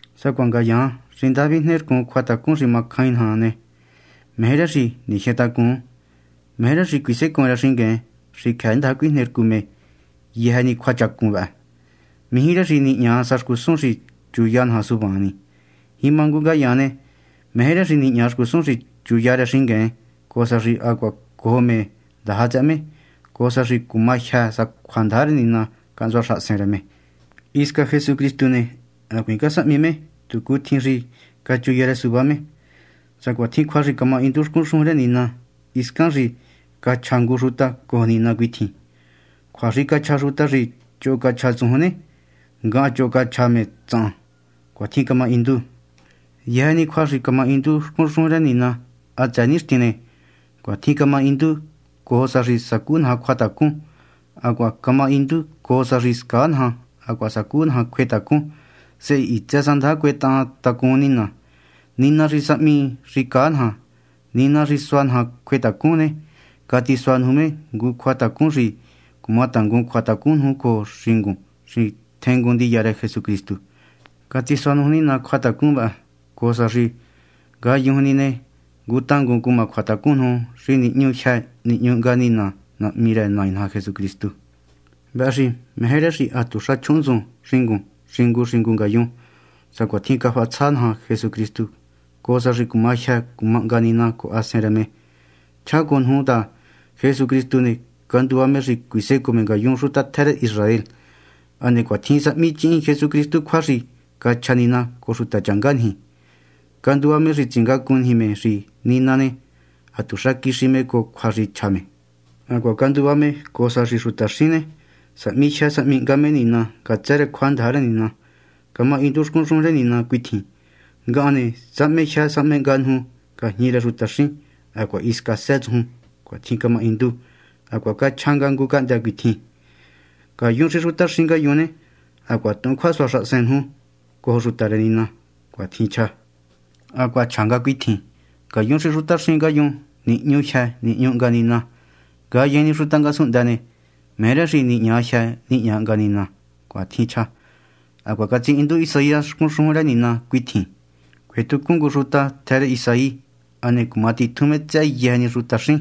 Sacuaha ngayaan xi ndaja vijne rcun cjuatacun xi macjain naja ne, meje rë xi nijyentacun, meje rë xi cuisecoon rë xingueen xi cjëë ndaja cuijne rcu me yëjë ni cjuachacun vëhë. Mijí rë xi nihña sa xcusun xi chuya naja suvaan ni. Jima ngu ngayaan ne, meje rë xi nihña xcusun xi chuya rë xingueen, cojo sa xi hacuaha cojo me ndaja tsëhë me, cojo sa xi cuma jyë sa cjuandaja rë Nina cahntsua xahasen rë me. Hisca Jesucristu ne, hacuiin casahmi me tu cutjin xi cachuya rë suvá me, sacuatjin cjua xi camahindu xcun xujun rë Nina hiscan xi cachja ngu xuta cojo Nina cuitjin: “Cjua xi cachja xuta xi choho cachja tsujun ne, ngahan choho cachja me tsahan.” Cuatjin camahindu. Yëjë ni cjua xi camahindu xcun xujun rë Nina hatsëë nixtin ne, cuatjin camahindu cojo sa xi sacú naja cjuatacun. Hacuaha camahindu cojo sa xi scaa naja hacuaha sacú naja cjuetacun, sehe hitsë sa ndaja cuetahan tacun Nina. Nina xi sahmi xi caa naja, Nina xi sua naja cjuetacun ne, catisua nuju me ngu cjuatacun xi cumatangun cjuatacun nuju cojo xingun xi tjengun ndiya rë Jesucristu. Catisua nuju Nina cjuatacun vëhë, cojo sa xi ngayujun ni ne, ngu tangun cuma cjuatacun nuju xi nihñu jyë nihñu hnga Nina Nahmi rë Nai naja Jesucristu. Vëhë xi meje rë xi hatuxa chjuhunntsun xingun xingu xingu ngayun sacuatjin cafahatsja naja Jesucristu, cojo sa xi cuma jyë cuma hnga Nina cojo Hasen rë me. Chjá cojo nuju ta Jesucristu ne, canduva me xi cuisecoo me ngayun xuta tjë rë Israel. Hane cuatjin sahmichihin Jesucristu cjua xi cachja Nina cojo xutachanga niji. Canduva me xi tsingacun niji me xi Nina ne, hatuxa quixi me cojo cjua xi chja me. Hacuaha canduva me cojo sa xi xutaxín ne, sahmi jyë sahmi hnga me Nina ngatsë rë cjuandaja rë Nina. Camahindu xcun xujun rë Nina cuitjin: Ngahan ne, sahme jyë sahme hnga nuju ngajñi rë xutaxín, hacuaha hisca së́ tsujun. Cuatjin camahindu. Hacuaha chja nga ngu cahndë́ cuitjin: Ngayun xi xutaxín ngayun ne, hacuaha tuhun cjuasua xahasen nuju cojo xuta rë Nina. Cuatjin chja. Hacuaha chja nga cuitjin: Ngayun xi xutaxín ngayun, nihñu jyë nihñu hnga Nina. Ngayejen ni xuta ngasunhndë ne, meje rë xi nihña jyë nihña hnga Nina. Cuatjin chja. Hacuaha catsihindu Isaías xcun xujun rë Nina cuitjin: Cuetjucun ngu xuta, tjë rë Isaí, hane cuma titjun me tsëhë yëjë ni xutaxín.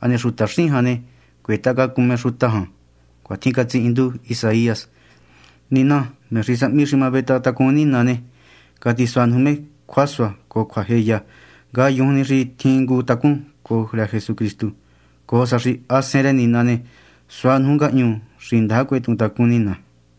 Hane xutaxín jan ne, cuetahacacun me xuta jan. Cuatjin catsihindu Isaías. Nina, me xi sahmi xi ma vetahantacun Nina ne, catisua nuju me cjuasua cojo cjuajeya, ngayujun xi tjin ngu tacún cojo rë Jesucristu, cojo sa xi Hasen rë Nina ne, sua nuju ngahñu xi ndaja cuetuhun tacún Nina.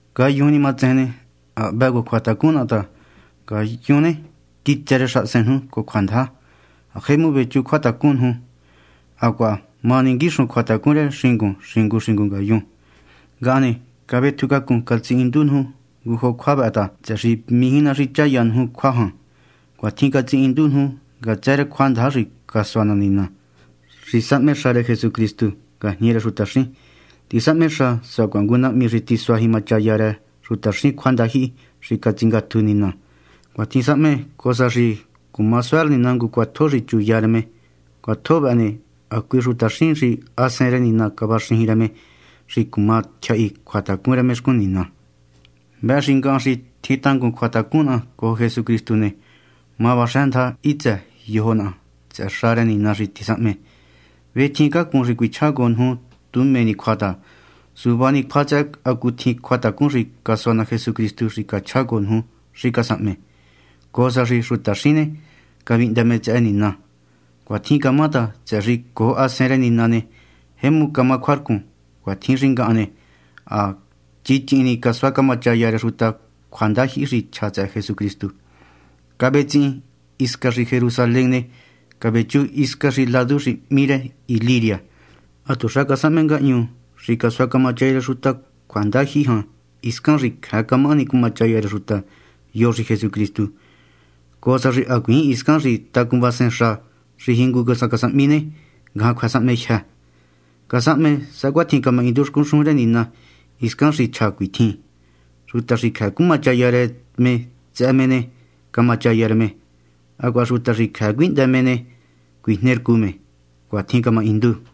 Ngayujun ni matsejen ne, ha hvë cojo cjuatacun naha ta ngayun ne, quitsë rë xahasen nuju cojo cjuandaja, ha jemu vechú cjuatacun nuju, hacuaha ma ninguixun cjuatacun rë xingun xingu xingu ngayun. Ngahan ne, cavetjucácun catsihindu nuju ngu jo cjua vëhë ta, tsëhë xi mijí ná xi chaya nuju cjua jan. Cuatjin catsihindu nuju ngatsë rë cjuandaja xi casua ná Nina, xi sahme xa rë Jesucristu ngajñi rë xutaxín. Tisahme xa sacuaha ngu nahmi, xi tisuá jimachaya rë xutaxín cjuandajyihi xi catsingatju Nina. Cuatjin sahme cojo sa xi cuma suá rë Nina ngu cjuatjo xi chuya rë me. Cjuatjo vëhë ne, hacui xutaxín, xi ha Hasen rë Nina cavaxëxin rë me xi cuma tyjahi cjuatacun rë me xcun Nina. Vëhë xi ngahan, xi tjin tangun cjuatacun naha cojo Jesucristu ne, ma vaxë́ndaja hitsë yojo naha tsëhë xa rë Nina xi tisahme. Vetjiincácun xi cuichjá cojo nuju tu mé ni cjua ta, suvá ni cjua tsëhë hacutjin cjuatacun xi casua ná Jesucristu xi cachjá cojo xi casahme, cojo sa xi xutaxín ne, cavihndë me tsëhë Nina. Cuatjin camá ta, tsëhë xi cojo Hasen rë Nina ne, jemu camá cjuarcun. Cuatjin xi ngahan ne, ha chichihin casuá camachaya rë xuta cjuandajyihi xi chja tsëhë Jesucristu, cavétsehen hisca Jerusalén ne, cavéchu hisca hiscan ladu xi hmí Iliria. Hatuxa casahme ngahñu xi casuá camachaya rë xuta cjuandajyihi jan hiscan xi cjëë camahani cumachaya rë xuta yo xi Jesucristu, cojo sa xi hacuiin hiscan xi tacunvasen xa xi jingu sa casahmi ne, ngajan cjuë́ sahmejyë. Casahme sacuatjin camahindu xcun xujun rë Nina hiscan xi chja cuitjin: Xuta xi cjëë cumachaya rë me tsëhë me ne, cumachaya rë me; hacuaha xuta xi cjëë cuihndë me ne, cuijnercu me. Cuatjin camahindu.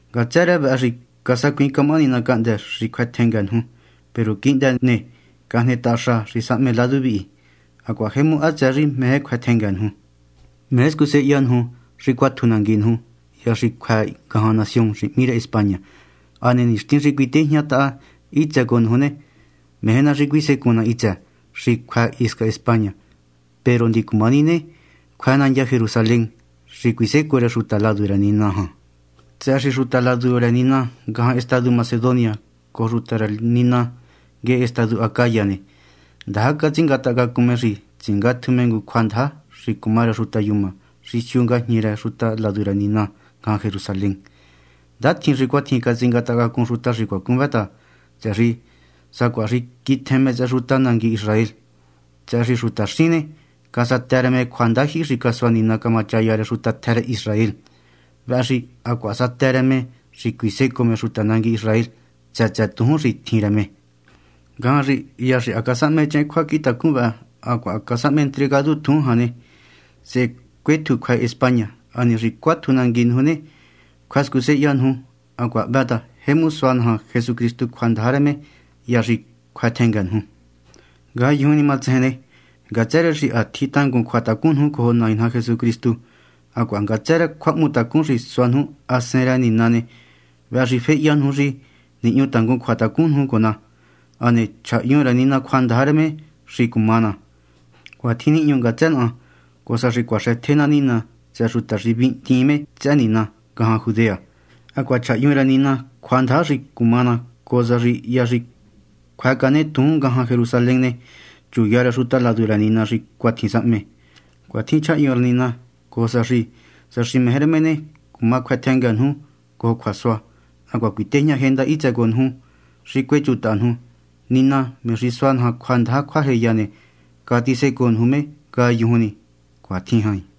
Ngatsë rë vëhë xi casacuiin camahani ná cahndë́ xi cjuë́ tjëngë nuju. Peru quihndë xi cajnetaha xa xi sahme ladu vihi, hacuaha jemu hatsëë xi meje cjuë́ tjëngë nuju ne, meje scusehenya nuju xi cuátju nangui nuju hya xi cjuë́ ngajan nación xi hmí España. Hane nixtin xi cuitejñataha hitsë cojo nuju ne, meje ná xi cuisecun ná hitsë xi cjuë́ hisca España. Peru ndicumaha ni ne, cjuë́ nandya Jerusalén, xi cuisécoo rë xuta ladu rë Nina jan ta, tsëhë xi xuta ladu rë Nina ngajan estadu Macedonia cojo xuta ladu rë Nina nguehe estadu Acaya ne, ndaja catsingatahacacun me xi tsingatju me ngu cjuandaja xi cuma rë xuta yuma xi siu ngajñi rë xuta ladu rë Nina ngajan Jerusalén. Ndatjin xi cuatjin catsingatahacacun xuta xi cuacun vë ta, tsëhë xi sacuaha xi quitjen me tsëhë xuta nangui Israel. Tsëhë xi xutaxín ne, casatë rë me cjuandajyihi xi casua Nina camachaya rë xuta tjë rë Israel, vëhë xi hacuaha satë rë me xi cuisecoo me xuta nangui Israel tsë tsë tujún xi tjin rë me. Ngajan xi hya xi ha casahmechehen cjuacjintacun vëhë hacuaha ha casahme entregadu tujún jan ne, sehe cuétju cjuë́ España. Hane xi cuátju nangui nuju ne, cjuë́ scusehenya nuju. Hacuaha hvë ta jemu sua naja Jesucristu cjuandaja rë me hya xi cjuë́ tjëngë nuju. Ngayujun ni matsejen ne, ngatsë rë xi tjin tangun cjuatacun nuju cojo Nai naja Jesucristu hacuaha ngatsë rë cjuahmutacun xi sua nuju Hasen rë Nina ne, vëhë xi féhya nuju xi nihñu tangun cjuatacun nuju cojo ná, hane chjahyun rë Nina cjuandaja rë me xi cuma ná. Cuatjin nihñu ngatsë naha, cojo sa xi cuaxëtje ná Nina tsëhë xuta xi vihndiin me tsëhë Nina ngajan Judea. Hacuaha chjahyun rë Nina cjuandaja xi cuma ná cojo sa xi hya xi cjuë́cane tujún ngajan Jerusalén ne, chuya rë xuta ladu rë Nina xi cuatjin sahme. Cuatjin chjahyun rë Nina cojo sa xi, sa meje rë me ne, cuma cjuë́tjëngë nuju cojo cjuasua hacuaha cuitejñajenda hitsë cojo nuju xi cuéchutaha nuju. Nina, me xi sua naja cjuandaja cjuajeya ne, catsicoo nuju me ngayujun ni. Cuatjin jain.